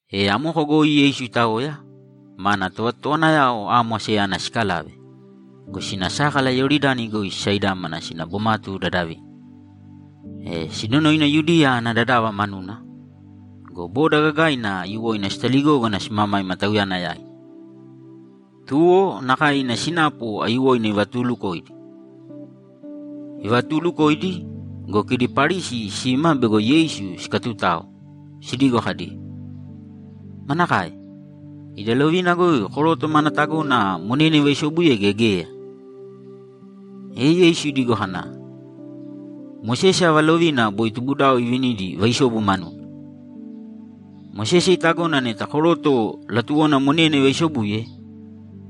E amoko goi Yeisu itaoya, mana tovatotowanayao amo asayana sikalave go, sina sákala Iyoridani goi sisaidámana sina bomatu dadavina, e sinonoina Yudiya ana dadava manuna. Go boda gagaina aiyuwoina sitaligógana simamaima Tauyana yaina. Tuwo, nakae ina sinapu aiyuwoina ivatuulukoidi. Ivatuulukoidi go, kidi Parisi sima bego Yeisu sikatutao, sidigo kadi, ‘Manakae? Ida lovina goi koroto mana tagona monena ivaisobuye gea geya?’ E Yeisu idigo kana, ‘Mosese ava lovina boi tubudao ivinidi vaisobu manuna?’ ‘Mosese itagona neta koroto latuwona monena ivaisobuye,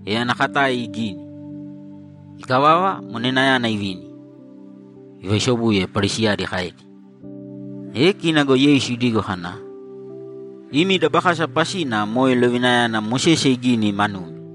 e ana katae igini. Ikavava, monenayana ivini, ivaisobuye’, Parisi kaedi. E kina go Yeisu idigo kana, ‘Imi dabakasa pasina moe lovinayana Mosese iginigini manumi.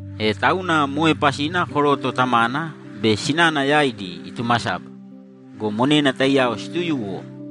E tauna moe pasina koroto tamana be sinana yaidi itumasaba go, monena taiyao situyuwo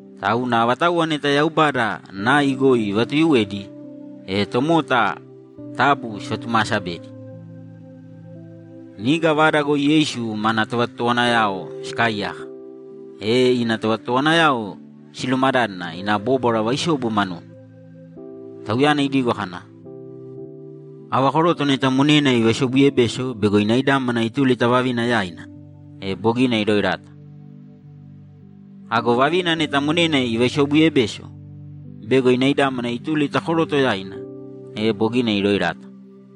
Tauna avatauwa neta Yaubada nai goi ivatuyuwedi, e tomota taabu sivatumaasabēdi.’ Niga vada goi Yeisu mana tovatotowanayao sikaaiyaka, e ina tovatotowanayao silumadádana ina bóbwara vaisobu manuna. Tauyana idigo kana, ‘Ava koroto neta monena ivaisobuyebeso bego inaidámana ituli ta vavina yaina, e bogina iroerata. Ago vavina neta monena ivaisobuyebeso bego inaidámana ituli ta koroto yaina, e bogina iroerata.’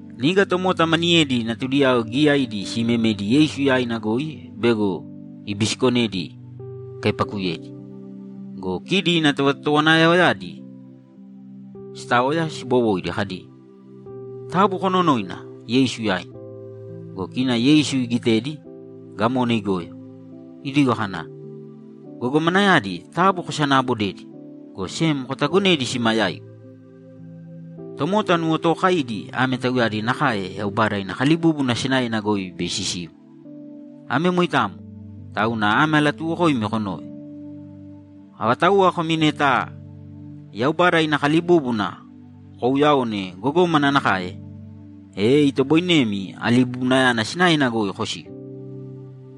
Niga tomota maniyedi natudiyao giyaidi siimemedi Yeisu yaina goi bego ibisikonedi ikaipakuyedi. Go kidi ina tovatotowanayaoyadi sitaoya sibowoidi kadi, ‘Taabu kononōina Yeisu yaina.’ Go kina Yeisu igitedi, gamona igoyo, idigo kana, ‘Gogomanayadi taabu kosanaabodēdi, go sem kotagonēdi sima yaigu. Tomota nuwotookaidi ame tauyadi nakae Yaubada ina kalibúbuna sinaena goi bei sisiu. Ame moitamo, tauna ame alatuuwokoimi konōve: Avatauwa komi neta Yaubada ina kalibúbuna kouuyaone gogómana nakae, e itoboinemi alibubunayana sinaena goi kosiu.’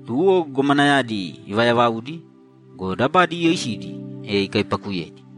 Tuwo gogomanayadi ivayavaudi go, dabadi iyoisidi, e ikaipakuyedi.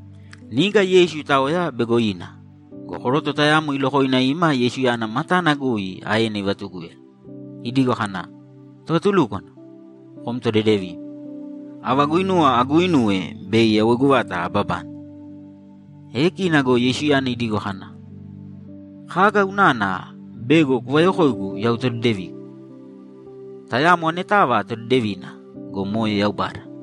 Niga Yeisu itaoya bego ina go, koroto tayamo ilokoina ima Yeisu matana goi aena ivatugúyala, idigo kana, ‘Tovatulúkwana, kom todedevim. Ava guinuwa aguuinuwe bei yawoigu vata ababane?’ E kina go Yeisuyana idigo kana, ‘Kaga unana bego kuvayokoigu yau todedevigu? Tayamo anetava todedevina go, moe Yaubada.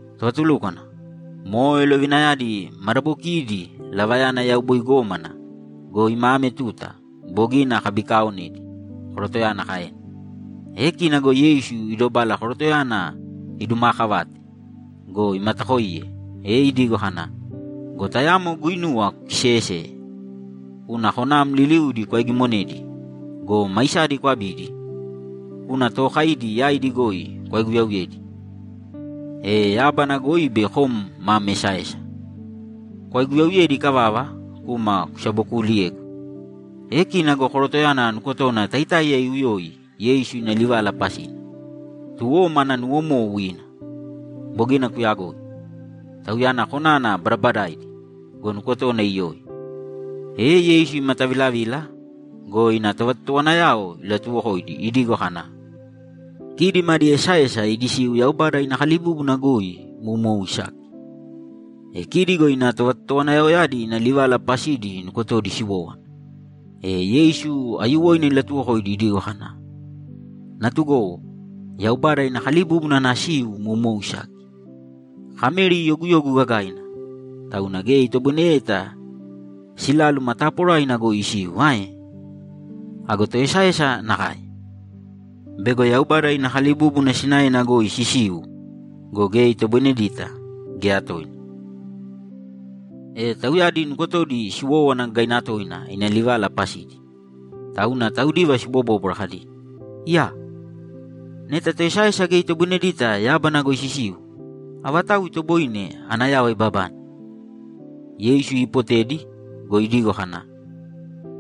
‘Tovatulúkwana, moe lovinayadi madabokiidi lavayana yau boi gómana go, ima ame tuta, bogina akabikaaonedi’, korotoyana kaena. E kina go Yeisu idobala korotoyana idumaakavate go, imatakoiye, e idigo kana, ‘Go tayamo guinuwa kukiseeyeseye. Kūna konam liliudi kwaigimonēdi go, maisadi kwabīdi, kūna tookaidi yaidi goi kwaiguyauyēdi, e yábana goi bei kom mam esaesa. Kwaiguyauyedi ikavava, kūma kusabokuuliyēgu.’ E kina go korotoyana nukotona taitáiya iuyoi Yeisu ina livala pasina, tuwo mana nuwomou ina. Bogina kuyagoi. Tauyana konana badabadaidi go, nukotona iyoi. E Yeisu imatavilavila go, ina tovatotowanayao ilatuwokoidi idigo kana, ‘Kidi madi esaesa idi siu Yaubada ina kalibúbuna goi moumou isaki.’ E kidi go ina tovatotowanayaoyadi ina livala pasidi nukotodi siwowówana. E Yeisu aiyuwoina ilatuwokoidi idigo kana, ‘Natugowo, Yaubada ina kalibúbuna ana siu moumou isaki. Kameri yoguyogu gagaina, tauna geya itoboineyeta siláluma taporaina goi isiu ae? Ago toesaesa nakae. Bego Yaubada ina kalibúbuna sinaena goi sisiu go, geya itoboinedita, geya toina.’ E tauyadi nukotodi siwówana gagaina toina ina livala pasidi, tauna taudiva sibobóbwara kadi, ‘Iyaa! Neta toesaesa geya itoboinedita yábana goi sisiu, avatau itoboine ana yava ibabane?’ Yeisu iipotedi go, idigo kana,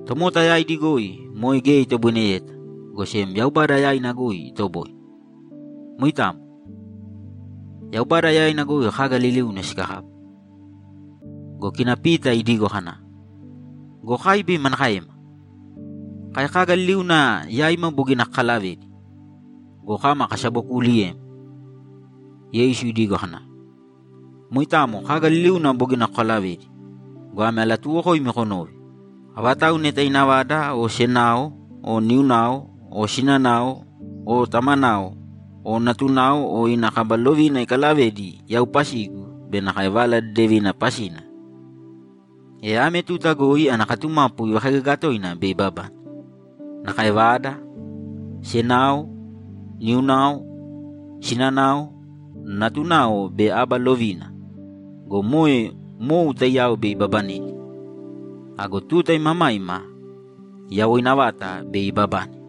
‘Tomota yaidi goi moe geya itoboineyeta, go sem Yaubada yaina goi itoboine. Moitamo. Yaubada yaina goi kaga liliuna sikakapu.’ Go kina Pita idigo kana, ‘Go kai bei manakaema? Kai kaga liliuna yaima bogina kakalavedi go, kama kasabokuuliyem.’ Yeisu idigo kana, ‘Moitamo kaga liliuna bogina kokalavedi go, ame alatuuwokoimi konōve: Avatau neta ina vada o senao o niunao o sinana o tamana o natunao o ina kaba lovina ikalavedi yau pasigu be nakae Vala Dedevina pasina, e ame tuta goi ana katumapu ivakaigaga toina bei ibabane. Nakae vada, senao, niunao, sinanao, natunao be aba lovina go, moe mou taiyao bei ibabanedi. Ago tuta imamaima yawoina vata bei ibabane.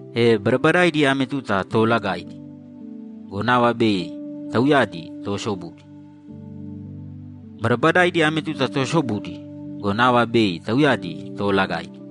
E badabadaidi ame tuta toolagaidi go, nava bei tauyadi toosobudi. Badabadaidi ame tuta toosobudi go, nava bei tauyadi toolagaidi.’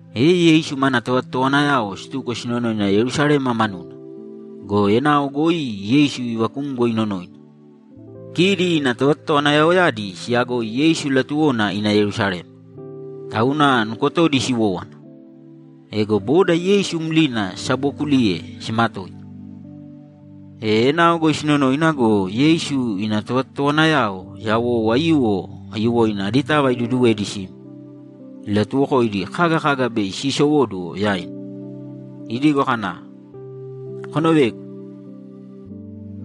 E Yeisu mana tovatotowanayao situko sinonoina Yerusalema manuna go, enao goi Yeisu ivakumgo inonoina. Kidi ina tovatotowanayaoyadi siyagoi Yeisu latuwona ina Yerusalema, tauna nukotodi siwówana. Ego boda Yeisu mlina sisabookuliye simatoita. E enao goi sinonoina go, Yeisu ina tovatotowanayao yawou aiyuwo aiyuwoina aditava iduduwedi sima, ilatuwokoidi kaga kaga bei siisowóduwo yaina. Idigo kana, ‘Konovēgu.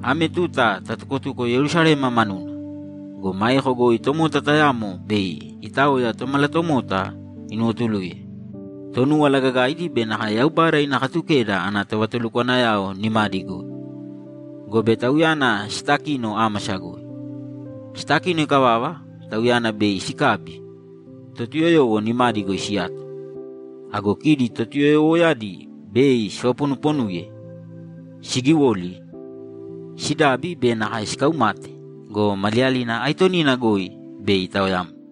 Ame tuta tatukotuko Yerusalema manuna go, maeko goi tomota tayamo bei itaoya Tomalatomota inuwotuluye Tonúwala Gagaidi be nakae Yaubada ina Katukeda ana tovatulukwanayao nimadi goi, gobe Tauyana sitakino ámasa goi. Sitakino ikavava, Tauyana bei sikabi, Totuyoyowo nimadi goi siyato. Ago kidi Totuyoyowoyadi bei sivaponuponuye, sigiwoli, sidabi be nakae sikaumate go, maliyalina aitonina goi bei itaoyamna.’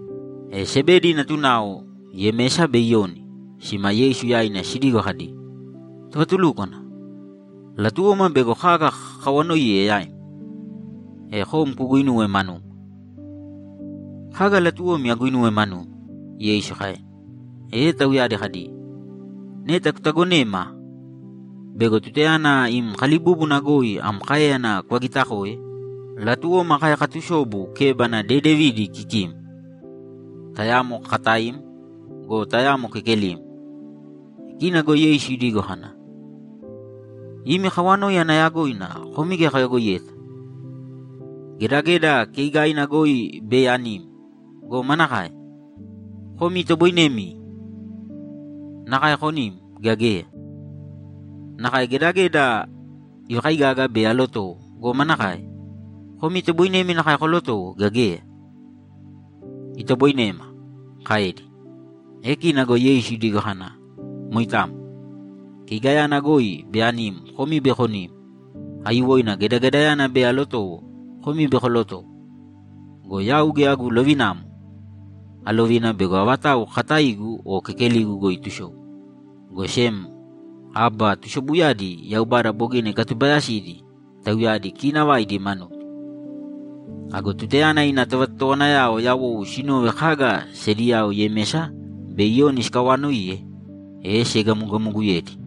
E Sebedi natunao, Yemesa be Iyoni, sima Yeisu yaina sidigo kadi, ‘Tovatulúkwana, latuwoma bego kaga kakawanoiye yaim, e kom kuguinuwe manuma.’ ‘Kaga latuwomi aguinuwe manumi?’ Yeisu kaena. E tauyadi kadi, ‘Neta kutagonēma bego tutayana im kalibúbuna goi am káeyana kuvagitakoe, latuwoma kai katusobu kébana dedevidi kikim, tayamo kakataim go, tayamo kekelim.’ E kina go Yeisu idigo kana, ‘Imi kawanoi ana yagoina komi geya koyagoiyeta. Gedageda keigaina goi bei anim go, manakae? Komi itoboinemi nakae konim, gea geya? Nakae gedageda ivakaigaga bei alotowo go, manakae? Komi itoboinemi nakae kolotowo, gea geya?’ ‘Itoboinema’, kaedi. E kina go Yeisu idigo kana, ‘Moitamo. Keigayana goi bei anim komi bei konim. Aiyuwoina gedagedayana bei alotowo, komi bei kolotowo. Go yau geya agu lovinamo alovina bego avatau kakataigu o kekeligu goi itusobu, go sem aba tusobuyadi Yaubada bogina ikatubayasidi tauyadi kiinavaidi manudi.’ Ago tutayana ina tovatotowanayao yawou sinove kaga sediyao Yemesa be Iyoni sikawaanoiye, e siegamogamoguyedi.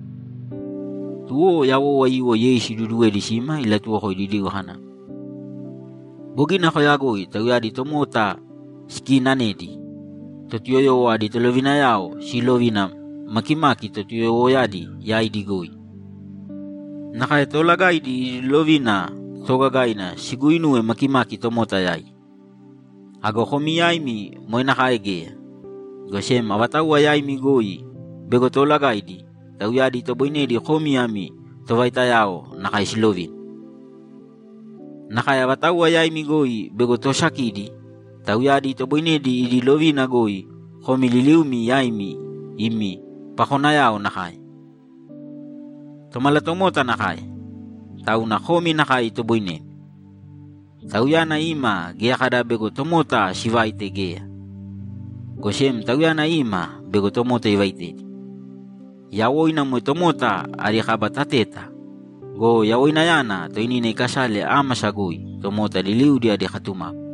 Tuwo yawou aiyuwo Yeisu iduduwedi sima ilatuwokoidi idigo kana, ‘Bogina koyagoi tauyadi tomota sikiinanedi Totuyoyowo adi tolovinayao siilovina makimaki Totuyoyowoyadi yaidi goi. Nakae toolagaidi idi lovina toogagaina siguuinuwe makimaki tomota yaidi. Ago komi yaimi moe nakae geya, go sem avatauwa yaimi goi bego toolagaidi, tauyadi itoboinedi komi ami tovaitayao nakae silovina. Nakae avatauwa yaimi goi bego toosakidi, tauyadi itoboinedi idi lovina goi komi liliumi yaimi imi pakonayao nakae. Tomalatomota nakae, tauna komi nakae itoboinemi. Tauyana ima geya kada bego tomota sivaite geya, go sem Tauyana ima bego tomota ivaitedi. Yawoina moe tomota adi kaba tateta go, yawoinayana toinina ikasale ámasa goi, tomota liliudi adi katumapu.’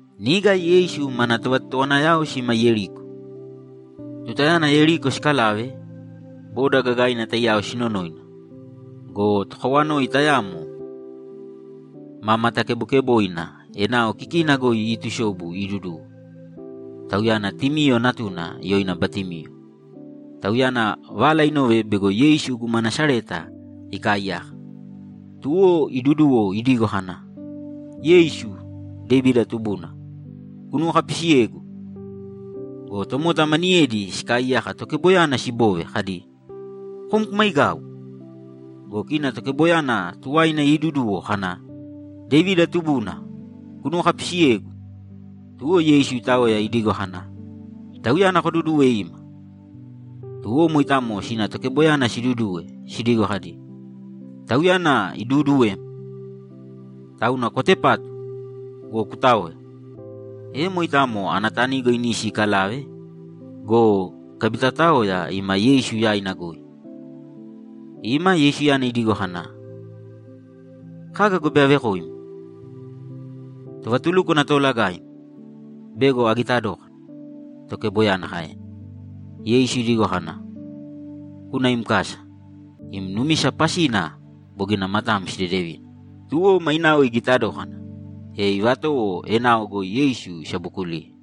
Niga Yeisu mana tovatotowanayao sima Yeriko. Tutayana Yeriko sikalave, boda gagaina taiyao sinonoina go, tokawanoi tayamo ma matakebokeboina enao kikina goi iitusobu iiduduwo; tauyana Timiyo natuna yoina Batimiyo. Tauyana vala inove bego Yeisu guma Nasareta ikaaiyaka. Tuwo iduduwo idigo kana, ‘Yeisu, Devida tubuna, kunuwokapisiyēgu!’ Go tomota maniyedi sikaaiyaka tokeboyana siboove kadi, ‘Kom kumaigāu!’ Go kina tokeboyana tuwaina iiduduwo kana, ‘Devida tubuna, kunuwokapisiyēgu!’ Tuwo Yeisu itaoya idigo kana, ‘Tauyana kodudūwe ima.’ Tuwo moitamo sina tokeboyana siduduwe sidigo kadi, ‘Tauyana iduuduwem. Tauna kwatepātu go, kutāoya!’ E moitamo ana tanigo inisi ikalave go, ikabitaotaoya ima Yeisu yaina goi. Ima, Yeisuyana idigo kana, ‘Kaga go bei avekoim?’ ‘Tovatulúkwana toolagaim, bego agita dókana’, tokeboyana kaena. Yeisu idigo kana, ‘Kūna im kasa. Im numisa pasina bogina matam sidedevina.’ Tuwo mainao igita dókana, e ivatowo enao goi Yeisu isabokuliye.